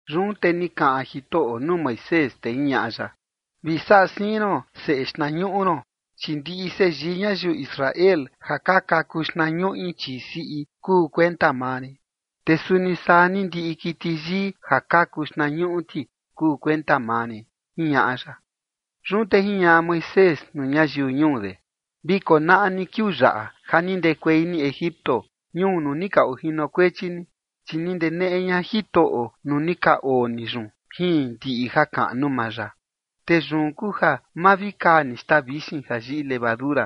Yun te ni kaꞌan Jitoꞌo nuu Moisés, te jiñaꞌa ya: ―Vi saꞌa siin ron seꞌe xtnañuꞌu ron, chi ndiꞌi seyii ñayiu Israel ja ka kaku xtnañuꞌi chii siꞌi kuu kuenta maa rin. Te suni saa ni ndiꞌi kiti yii ja kaku xtnañuꞌu ti kuu kuenta maa rin ―jiñaꞌa ya. Yun te jiñaꞌa Moisés nuu ñayiu ñuu de: ―Vi konaꞌa ni kiuu yaꞌa ja ni ndekuei ni Egipto, ñuu nuu ni ka ojinokuechi ni, chi ni ndeneꞌe ña Jitoꞌo nuu ni ka oo ni yun jin ndiꞌi jakaꞌnu maa ya. Te yun kuu ja ma vi kaa ni xtaa vixin ja yiꞌi levadura.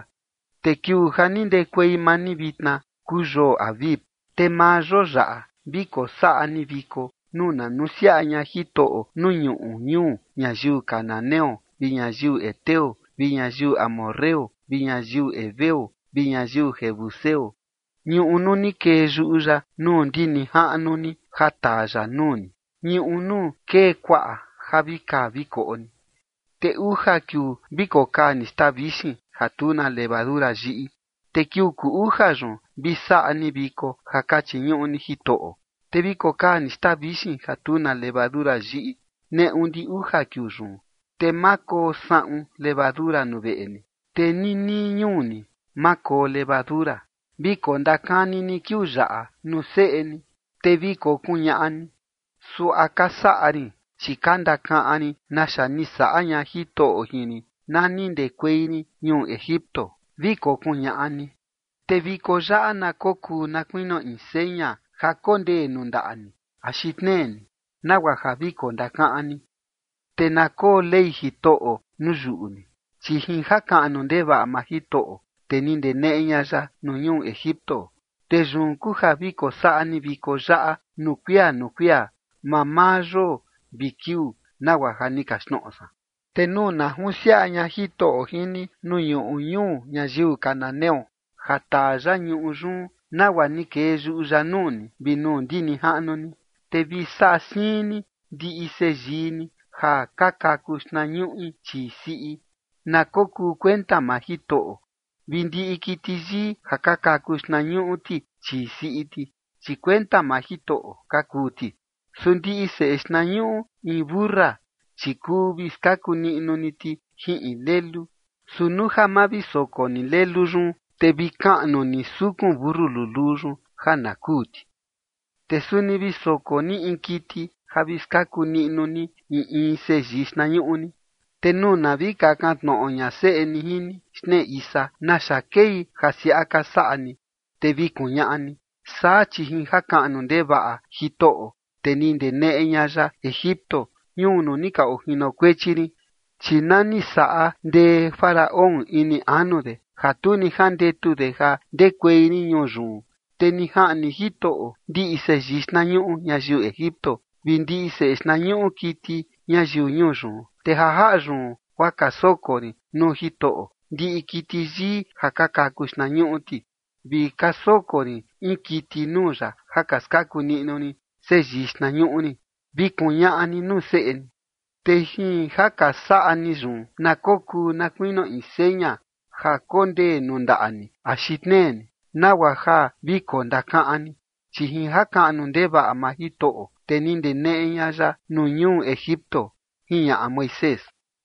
Te kiuu ja ni ndekuei maa ni vitna kuu yoo Abib. Te maa yoo yaꞌa vi kosaꞌa ni viko nuu na nusiaꞌa ña Jitoꞌo nuu ñuꞌu ñuu ñayiu cananeo vi ñayiu heteo vi ñayiu amorreo vi ñayiu heveo vi ñayiu jebuseo, ñuꞌu nuu ni kee yuꞌu ya nuu ndi nijaꞌnu ni ja taa ya nuu ni, ñuꞌu nuu kee kuaꞌa ja vi kaa vi koꞌo ni. Te uja kiuu vi kokaa ni xtaa vixin ja tu na levadura yiꞌi, te kiuu kuu uja yun vi saꞌa ni viko ja ka chiñuꞌu ni Jitoꞌo. Te vi kokaa ni xtaa vixin ja tu na levadura yiꞌi neꞌu ndi uja kiuu yun, te ma koo saꞌun levadura nuu veꞌe ni, te ni nii ñuu ni, ma koo levadura. Vi kondakani ni kiuu yaꞌa nuu seꞌe ni, te vi kokuñaꞌa ni: “Suaꞌa ka saꞌa rin, chi ka ndakaꞌan rin naxa ni saꞌa ña Jitoꞌo jin rin na ni ndekuei rin ñuu Egipto”, vi kokuñaꞌa ni. Te viko yaꞌa na kokuu na kuinio in seña ja kondee nuu ndaꞌa ni axi tnee ni, nagua ja vi kondakaꞌan ni, te na koo Ley Jitoꞌo nuu yuꞌu ni, chi jin jakaꞌnu ndevaꞌa maa Jitoꞌo, te ni ndeneꞌe ña ya nuu ñuu Egipto. Te yun kuu ja vi kosaꞌa ni viko yaꞌa nuu kuia nuu kuia mamaa yoo vi kiuu nagua ja ni kaxtnoꞌo san. ’Te nuu na junsiaꞌa ña Jitoꞌo jin ni nuu ñuꞌu ñuu ñayiu cananeo, ja taa ya ñuꞌu yun nagua ni kee yuꞌu ya nuu ni vi nuu ndi nijaꞌnu ni, te vi saꞌa siin ni ndiꞌi seyii ni ja ka kaku xtnañuꞌi chii siꞌi, na kokuu kuenta maa Jitoꞌo, vi ndiꞌi kiti yii ja ka kaku xtnañuꞌu ti chii siꞌi ti, chi kuenta maa Jitoꞌo ka kuu ti. Su ndiꞌi seꞌe xtnañuꞌu in mentu siꞌi, chi kuu vi skaku niꞌnu ni ti jin in lelu. Su nuu ja ma vi soko ni lelu yun, te vi kaꞌnu ni sukun mentu luluu yun ja na kuu ti. Te suni vi soko ni in kiti ja vi skaku niꞌnu ni in in seyii xtnañuꞌu ni. Te nuu na vi kakan tnoꞌo ña seꞌe ni jin ni xtnee isa: “¿Naxa kei ja siaꞌa ka saꞌa ni?”, te vi kuñaꞌa ni: “Saa chi jin jakaꞌnu ndevaꞌa Jitoꞌo te ni ndeneꞌe ña ya Egipto, ñuu nuu ni ka ojinokuechi rin, chi na ni saꞌa ndee Faraón ini anu de ja tu ni jandetu de ja ndekuei rin ñuu yun, te ni jaꞌni Jitoꞌo ndiꞌi seyii xtnañuꞌu ñayiu Egipto vi ndiꞌi seꞌe xtnañuꞌu kiti ñayiu ñuu yun. Te ja jaꞌa yun guaa ka soko rin nuu Jitoꞌo ndiꞌi kiti yii ja ka kaku xtnañuꞌu ti, vi ka soko rin in kiti nuu ya ja ka skaku niꞌnu rin seyii xtnañuꞌu rin”, vi kuñaꞌa ni nuu seꞌe ni. Te jin ja ka saꞌa ni yun na kokuu na kuinio in seña ja kondee nuu ndaꞌa ni axi tnee ni, nagua ja vi kondakaꞌan ni, chi jin jakaꞌnu ndevaꞌa maa Jitoꞌo, te ni ndeneꞌe ña ya nuu ñuu Egipto ―jiñaꞌa Moisés.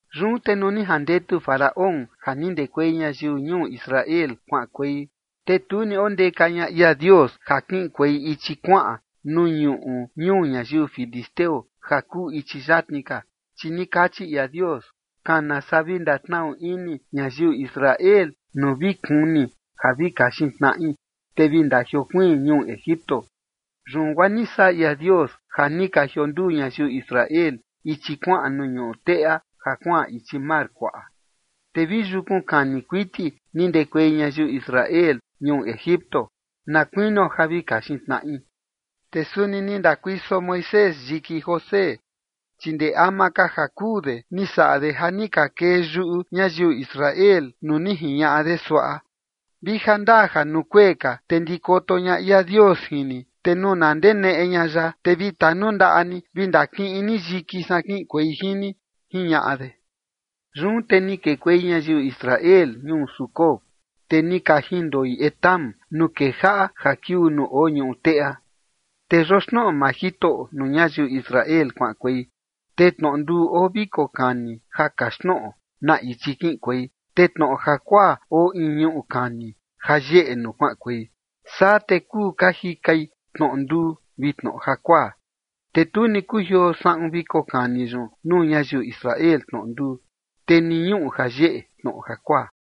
Yun te nuu ni jandetu Faraón ja ni ndekuei ñayiu ñuu Israel kuaꞌankuei, te tu ni ondeka ña ia Dios ja kiꞌinkuei ichi kuaꞌan nuu ñuꞌu ñuu ñayiu filisteo ja kuu ichi yatni ka, chi ni kachi ia Dios: “Kana saa vi ndatnaꞌu ini ñayiu Israel nuu vi kuni ja vi kaxin tnaꞌi, te vi ndajiokuiin ñuu Egipto”. Yun guaa ni saꞌa ia Dios ja ni ka jionduu ñayiu Israel ichi kuaꞌan nuu ñuꞌu teꞌa ja kuaꞌan ichi mar kuaꞌa. Te vi yukun kani kuiti ni ndekuei ñayiu Israel ñuu Egipto na kuinio ja vi kaxin tnaꞌi. Te suni ni ndakuiso Moisés yiki José, chi ndee ama ka ja kuu de ni saꞌa de ja ni ka kee yuꞌu ñayiu Israel nuu ni jiñaꞌa de suaꞌa: “Vi jandaa ja nuu kuee ka, te ndikoto ña ia Dios jin ni, te nuu na ndeneꞌe ña ya, te vi tanundaꞌa ni vi ndakiꞌin ni yiki san kiꞌinkuei jin ni”, jiñaꞌa de. Yun te ni kekuei ñayiu Israel ñuu Sucot, te ni ka jindoi Etam nuu kejaꞌa ja kiuu nuu oo ñuꞌu teꞌa. Te yoxnoꞌo maa Jitoꞌo nuu ñayiu Israel kuaꞌankuei, te tnoꞌo nduu oo viko kani ja kaxtnoꞌo na ichi kiꞌinkuei, te tnoꞌo jakuaa oo in ñuꞌu kani ja yeꞌe nuu kuaꞌankuei. Saa te kuu ka jikai tnoꞌo nduu vi tnoꞌo jakuaa. Te tu ni kujioo saꞌun viko kani yun nuu ñayiu Israel tnoꞌo nduu, te ni ñuꞌu ja yeꞌe tnoꞌo jakuaa.